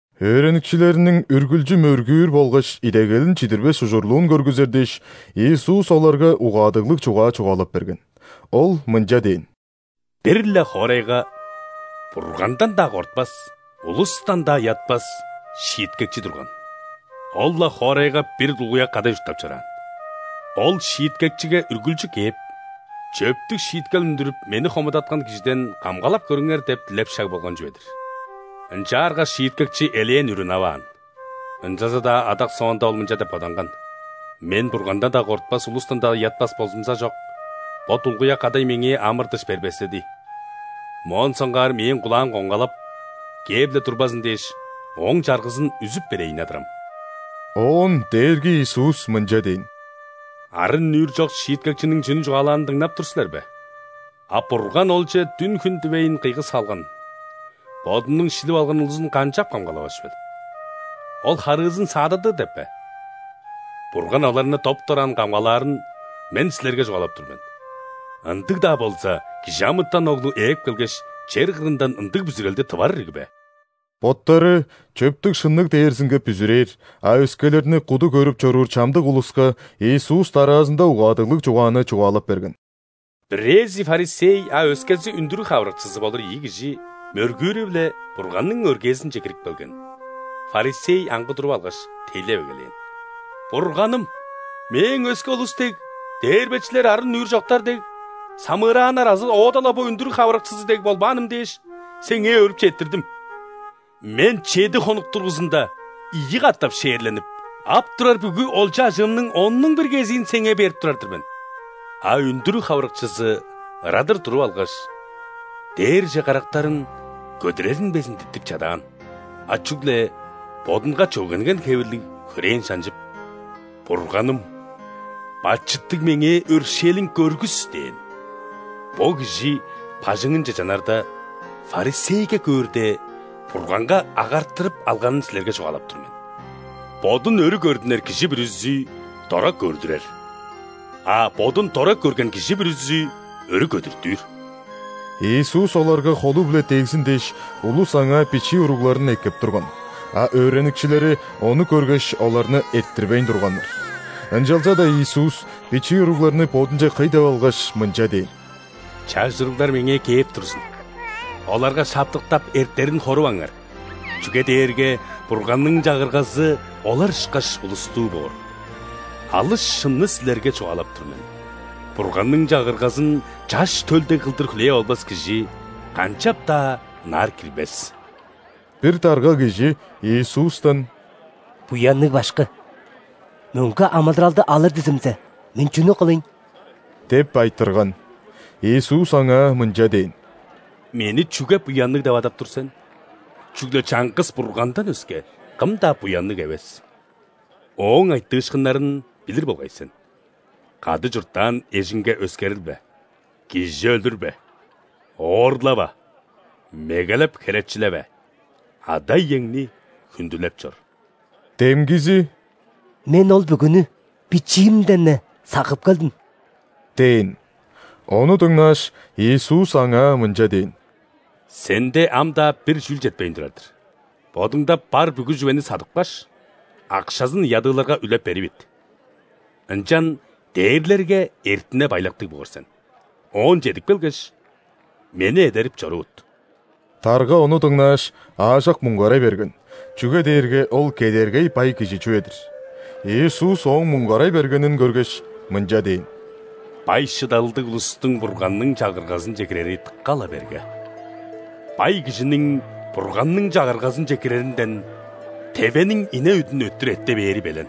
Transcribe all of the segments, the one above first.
Өөреникчилериниң үргүлчү мөргүүр болгаш идегелин чидирбес ужурлуун көргүзер дээш, Иисус оларга угаадыглыг чугаа чугаалап берген. Ол мынча дээн: «Бир-ле хоорайга Бургандан-даа кортпас, улустан-даа ыятпас шииткекчи турган. Ол-ла хоорайга бир дулгуяк кадай чурттап чораан. Ол шииткекчиге үргүлчү кээп: „Чөптүг шииткел үндүрүп, мени хомудаткан кижиден камгалап көрүңер“ – деп дилеп шаг болган чүве-дир. Ынчаарга шииткекчи элээн үр ынаваан. Ынчалза-даа адак соонда ол мынча деп боданган: „Мен Бургандан-даа кортпас, улустан-даа ыятпас болзумзажок, бо дулгуяк кадай меңээ амыр-дыш бербестеди. Моон соңгаар мээң кулаам коңгалап, кээп-ле турбазын дээш, ооң чаргызын үзүп берейн адырам“». Оон Дээрги Иисус мынча дээн: «Арын-нүүр чок шииткекчиниң чүнү чугаалаанын дыңнап тур силер бе? А Бурган Олче дүн-хүн дивейн кыйгы салган, Бодунуң шилип алган улузун канчап камгалавас чүвел? Ол харыызын саададыр деп бе? Бурган оларны доп-дораан камгалаарын Мен силерге чугаалап тур мен. Ындыг-даа болза, ·Кижи амытан Оглу ээп келгеш, чер кырындан ындыг бүзүрелди тывар ирги бе?» Боттары чөптүг-шынныг дээрзинге бүзүрээр, а өскелерни куду көрүп чоруур чамдык улуска Иисус дараазында угаадыглыг чугааны чугаалап берген: «Бирээзи ·фарисей, а өскези үндүрүг хавырыкчызы болур ийи кижи мөргүүрү-биле Бурганның өргээзинче кирип келген. Фарисей аңгы туруп алгаш, тейлеп эгелээн: „Бурганым, мээң өске улус дег: дээрбечилер, арын-нүүр чоктар дег, самыырааннар азы оода-ла бо үндүрүг хавырыкчызы дег болбааным дээш, Сеңээ өөрүп четтирдим. Мен чеди хонук дургузунда ийи катап ·шээрленип, ап турар бүгү олча-ажыымның оннуң бир кезиин Сеңээ берип турар-дыр мен“. А үндүрүг хавырыкчызы ырадыр туруп алгаш, дээрже карактарын көдүрерин безин диттип чадаан, а чүгле бодунга чөгенген хевирлиг хөрээн шанчып: „Бурганым, бачыттыг меңээ өршээлиң көргүс“ – дээн. Бо кижи бажыңынче чанарда, ·фарисейге көөрде, Бурганга агартырып алганын силерге чугаалап тур мен. Бодун өрү көрдүнер кижи бүрүзү дора көрдүрер, а бодун дора көрген кижи бүрүзү өрү көдүртүр». Иисус оларга холу-биле дегзин дээш, улус Аңаа бичии уругларын эккеп турган. А өөреникчилери, ону көргеш, оларны эрттирбейн турганнар. Ынчалза-даа Иисус бичии уругларны Бодунче кый деп алгаш, мынча дээн: «Чаш уруглар Меңээ кээп турзун, оларга шаптыктап, эртерин хоруваңар! Чүге дээрге Бурганның Чагыргазы олар ышкаш улустуу боор. Алыс шынны силерге чугаалап тур мен: Бурганның Чагыргазын чаш төл дег кылдыр хүлээп албас кижи канчап-даа ынаар кирбес». Бир дарга кижи Иисустан: «Буянныг Башкы! Мөңге амыдыралды алыр дизимзе, мен чүнү кылыйн?» – деп айтырган. Иисус аңаа мынча дээн: «Мени чүге буянныг деп адап тур сен? Чүгле чаңгыс Бургандан өске, кым-даа буянныг эвес. Ооң айтыышкыннарын билир болгай сен: кады чурттаан эжиңге өскерилбе, кижи өлүрбе, оорлава, мегелеп херечилеве, ада-иеңни хүндүлеп чор». Демгизи: «Мен ол бүгүнү бичиимден-не сагып келдим» – дээн. Ону дыңнааш, Иисус аңаа мынча дээн: «Сенде ам-даа бир чүүл четпейн турар-дыр: бодуңда бар бүгү чүвени садыпкаш, акшазын ядыыларга үлеп беривит, ынчан дээрлерге эртине-байлактыг боор сен. Оон чедип келгеш, Мени эдерип чорувут». Дарга ону дыңнааш, аажок муңгарай берген, чүге дээрге ол кедергей бай кижи чүве-дир. Иисус ооң муңгарай бергенин көргеш, мынча дээн: «Бай-шыдалдыг улустуң Бурганның Чагыргазынче кирери дыка-ла берге! Бай кижиниң Бурганның Чагыргазынче киреринден тевениң ине үдүн өттүр эрте бээри белен».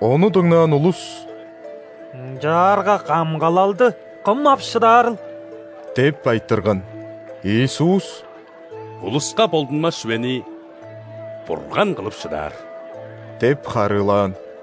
Ону дыңнаан улус: «Ынчаарга камгалалды кым ап шыдаарыл?!» – деп айтырган. Иисус: «Улуска болдунмас чүвени Бурган кылып шыдаар» – деп харыылаан.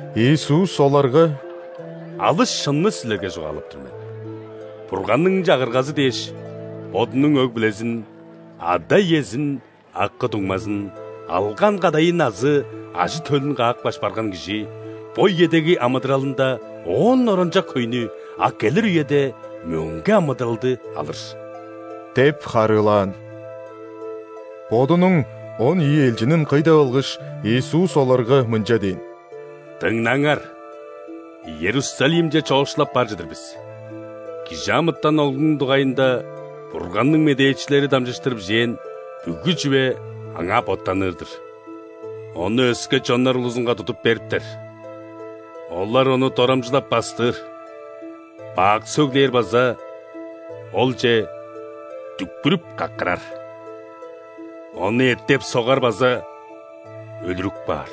Иисус оларга: «Алыс шынны силерге чугаалап тур мен: Бурганның Чагыргазы дээш, бодунуң өг-бүлезин: ада-иезин, акы-дуңмазын, алган кадайын азы ажы-төлүн каапкаш барган кижи бо үедеги амыдыралында оон оранчок хөйнү, а келир үеде – мөңге амыдыралды алыр» – деп харыылаан. Бодунуң он ийи элчинин кый деп алгаш, Иисус оларга мынча дээн: «Дыңнаңар, Иерусалимче чоокшулап бар чыдыр бис, ·Кижи амытан Оглунуң дугайында Бурганның медээчилери дамчыштыр бижээн бүгү чүве аңаа боттаныр-дыр. Ону өске чоннар улузунга тудуп бериптер, олар Ону дорамчылап-бастыр, бак сөглээр база Олче дүкпүрүп-каккырар. Ону эттеп-согар база өлүрүп каар.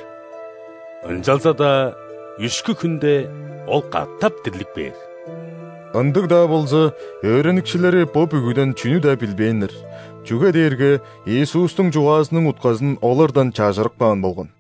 Ынчалза-даа үшкү хүнде Ол катап дирлип кээр». Ындыг-даа болза, өөреникчилери бо бүгүден чүнү-даа билбээннер, чүге дээрге Иисустуң чугаазының утказын олардан чажырып каан болган.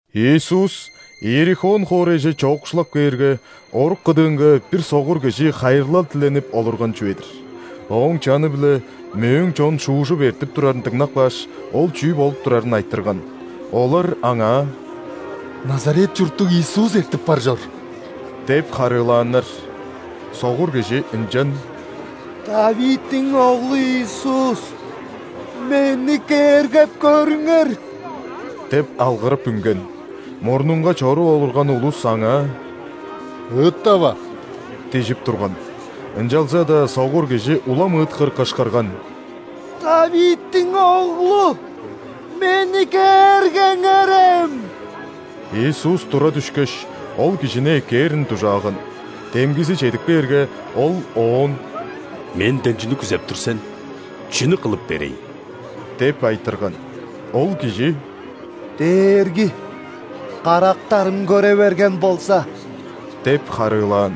Иисус Иерихон хоорайже чоокшулап кээрге, орук кыдыынга бир согур кижи хайырлал диленип олурган чүве-дир. Ооң чаны-биле мөөң чон шуужуп эртип турарын дыңнап кааш, ол чүү болуп турарын айтырган. Олар аңаа: «Назарет чурттуг Иисус эртип бар чор» – деп харыылааннар. Согур кижи ынчан: «·Давидтиң Оглу, Иисус! Мени кээргеп көрүңер!» – деп алгырып үнген. Мурнунга чоруп олурган улус аңаа: «Ыыттава!» – ди��ип турган, ынчалза-даа согур кижи улам ыыткыр кышкырган: «Давидтиң Оглу! Мени кээргеңерем!» Иисус тура дүшкеш, ол кижини эккээрин дужааган. Демгизи чедип кээрге, Ол оон: «Менден чүнү күзеп тур сен? Чүнү кылып берейн?» – деп айтырган. Ол кижи: «Дээрги, карактарым көре берген болза!» – деп харыылаан.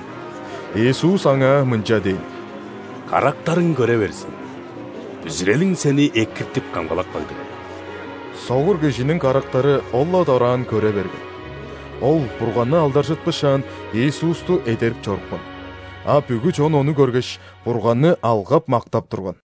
Иисус аңаа мынча дээн: «Карактарың көре берзин! Бүзүрелиң сени экиртип-камгалап кагды!» Согур кижиниң карактары ол-ла дораан көре берген. Ол Бурганны алдаржытпышаан, Иисусту эдерип чорупкан. А бүгү чон, ону көргеш, Бурганны алгап-мактап турган.